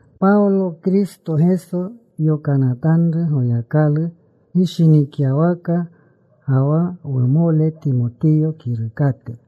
Pawlo, Kristo Geso yokanatanru, Goyakalu gishinikyawaka, ga wa wumole Timotiyo kirukate.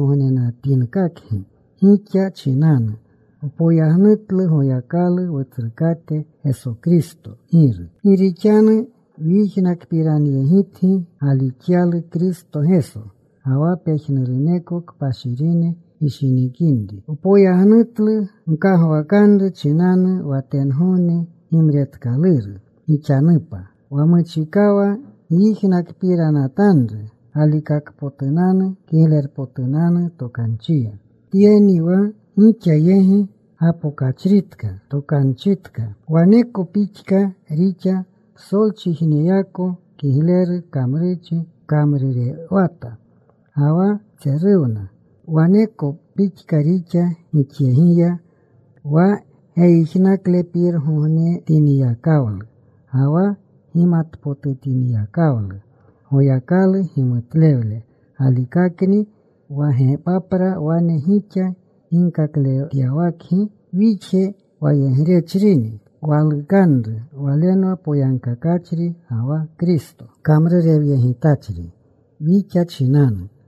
Psolgogneko wagjigogneyeegognenatinkakgi, gixa chinanu wpoyagnutlu Goyakalu, Wutsrukate Geso Kristo Giru. Gi rixanu wyijnakpiranyegitgi galixyalu Kristo Geso, ga wa pejnuruneko kpashirine gishinikinri. Wpoyagnutlu gkagwakanru chinanu wa tengogne gimretkaluru gixanupa, wa muchikawa gyijnakpiranatanru galikakpotunanu Kiglerpotunanu Tokanchiya. Tyeni wa gixa yegi gapokachritka tokanchitka. Waneko pixka rixa psolchijnekoyako. Kigleru kamrurchi kamrurewata ga wa tseruwna. Waneko pixka rixa gixyegiya wa geyijnaklepirangognetinyakawlu ga wa gimatpotutinyakawlu Goyakalu gimutlewle galikakni. Wa Gepapra wane gixa ginkakletyawakgi. Wixje wayegrechrini walukanru. Walenwa poyagkakachri ga wa Kristo kamrurewyegitachri wixa chinanu.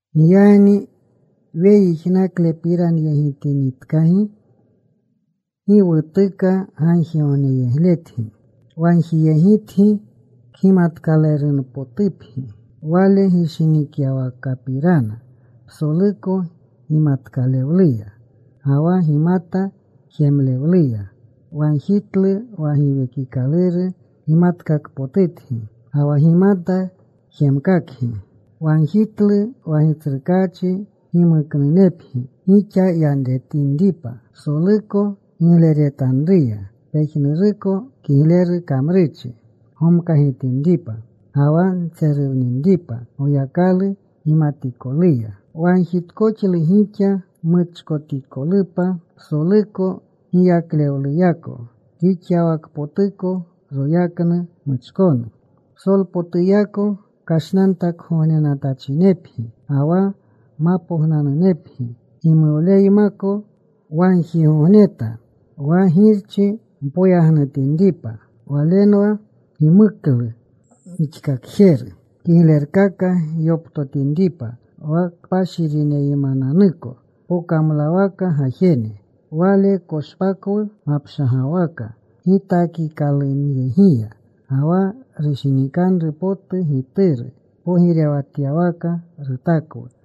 Giyagni weyijnaklepiranyegitinitkagi gi wutuka gagjigogneyegletgi. Wagjiyegitgi kgimatkalerunpotupgi Wale gishinikyawakapirana, psoluko gimatkalewleya ga wa gimata jemlewluya. Wagjitlu wa Giwekikaluru gimatkakpotutgi ga wa gimata jemkakangi. Wagjitlu wa Gitsrukaachi gimuknunepgi gixa yanretinripa psoluko rugleretanruya, pejnuruko kigleru kamrurchi gomkagitinripa, ga wa ntseruwninripa Goyakalu gimatikoluya. Wagjitkoxlu gixa muchkotikolupa psoluko giyaklewluyako, rixyawakpotuko royaknu muchkonu, psolpotuyako kashnantakgognenatachinepgi ga wa mapognanunepgi gimuwleymako. Wagjigogneta wa Girchi mpoyagnutinripa. Walenwa gimuklu gixkakjeru kiglerkaka gyoptotinripa wa kpashirineymananuko pokamlawaka gajene. Wale koshpakwu mapshagawaka gitakikalunyegiya, ga wa rushinikanru potu Gituru pogirewatyawaka rutakwu.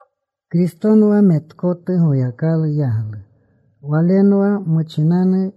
Kristonwa metkotu Goyakalu yaglu. Walenwa muchinanu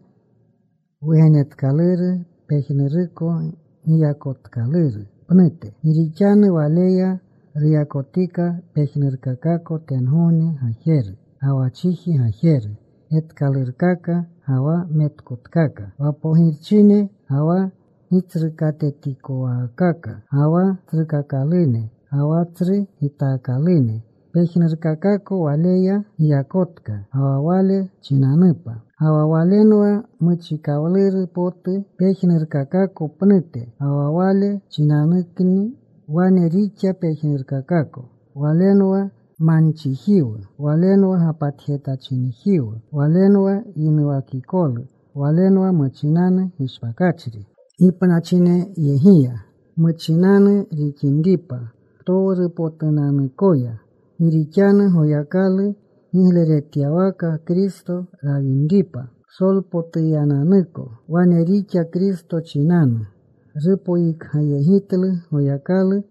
wugenetkaluru pejnuruko giyakotkaluru pnute. Gi rixanu Waleya ruyakotika pejnurkakako tengogne gajeru, ga wa chiji gajeru, getkalurkaka ga wa metkotkaka, wa pogirchine, ga wa gitsrukatetikowaakaka, ga wa tsrukakalune, ga wa tsru gitaakalune. Pejnurkakako Waleya giyakotka ga wa Wale chinanupa. Ga wa Walenwa muchikawluru potu pejnurkakako pnute. Ga wa Wale chinanukni wane rixa pejnurkakako. Walenwa manchijiwu; Walenwa gapatjetachinejiwu. Walenwa yinuwakikolu. Walenwa muchinanu gishpakachri gipnachinyegiya, muchinanu rixinripa ptowrupotunanukoya. Gi rixanu Goyakalu gigleretyawaka Kristo rawinripa psolpotunanuyako. Wane rixa Kristo chinanu rupoyikgayegitlu Goyakalu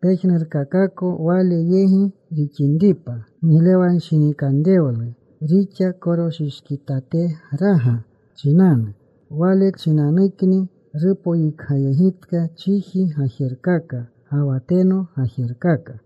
pejnurkakako Wale yegi rixinripa. Giglewanshinikanrewlu rixa koroshishkitategraga chinanu. Wale chinanukni rupoyikgayegitka chiji gajerkaka ga wa tengogne gajerkaka.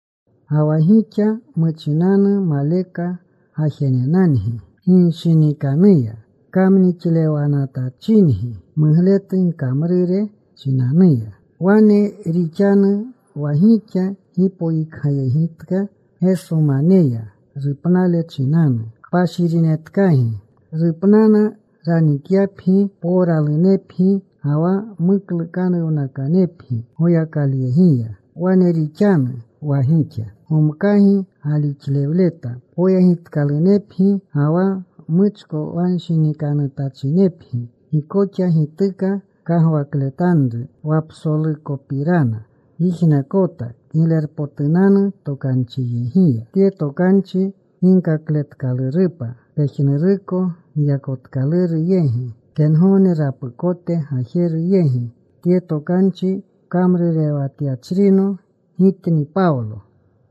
Ga wa gixa muchinanu maleka gajenenangi. Ginshinikanuya kamnixlewanatyachingi mugletu gkamrure chinanuya. Wane rixanu wa gixa gipoyikgayegitka Gesomaneya rupnale chinanu, kpashirinetkagi. Rupnana ranikyapgi powralunepgi ga wa muklukanuwnakanepgi Goyakaluyegiya. Wane rixanu wa gixa gomkagi galixlewleta poyegitkalunepgi ga wa muchkowanshinikanutachinepgi. Gi koxa gituka kagwakletanru wa psolukopirana gyijnakota Kiglerpotunanu Tokanchiyegiya. Tye tokanchi ginkakletkalurupa pejnuruko giyakotkaluru yegi, tengogne rapukote gajeru yegi. Tye tokanchi kamrurewatyachrino gitni Pawlo.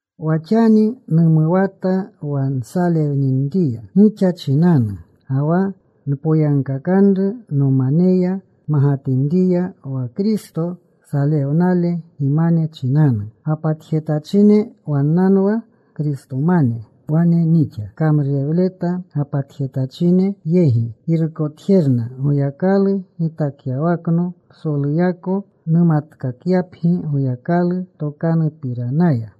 Wa xani numuwata wa nsalewninriya gixa chinanu, ga wa npoyagkakanru nomaneya magatinriya wa Kristo salewnale gimane chinanu. Gapatjetachine wannanwa Kristomane. Wane nixa kamrurewleta gapatjetachine yegi. Girukotjerna Goyakalu gitakyawakno psoluyako numatkakyapgi Goyakalu tokanupiranaya.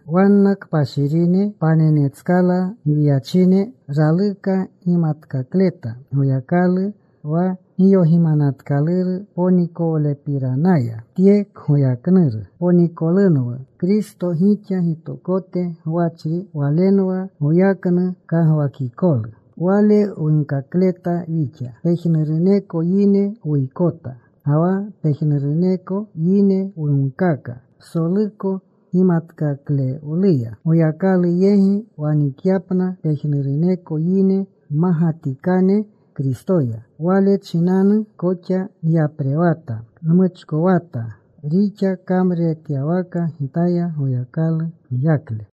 Wanna kpashirine, panenetskala gwiyachine, raluka gimatkakleta Goyakalu wa giyogimanatkaluru ponikolewlepiranaya. Tye kgoyaknuru ponikolewlunwa Kristo, gixa gitokote gwachri. Walenwa goyaknu kagwakikolu. Wale wunkakleta wixa. Pejnuruneko yine wuykota, ga wa pejnuruneko yine wunkaka psoluko gimatkalewluya, Goyakalu yegi wanikyapna pejnuruneko yine mmagatikane Kristoya. Wale chinanu koxa nyaprewata. Nmuchkowata, rixa kamruretyawaka gitaya Goyakalu giyakle.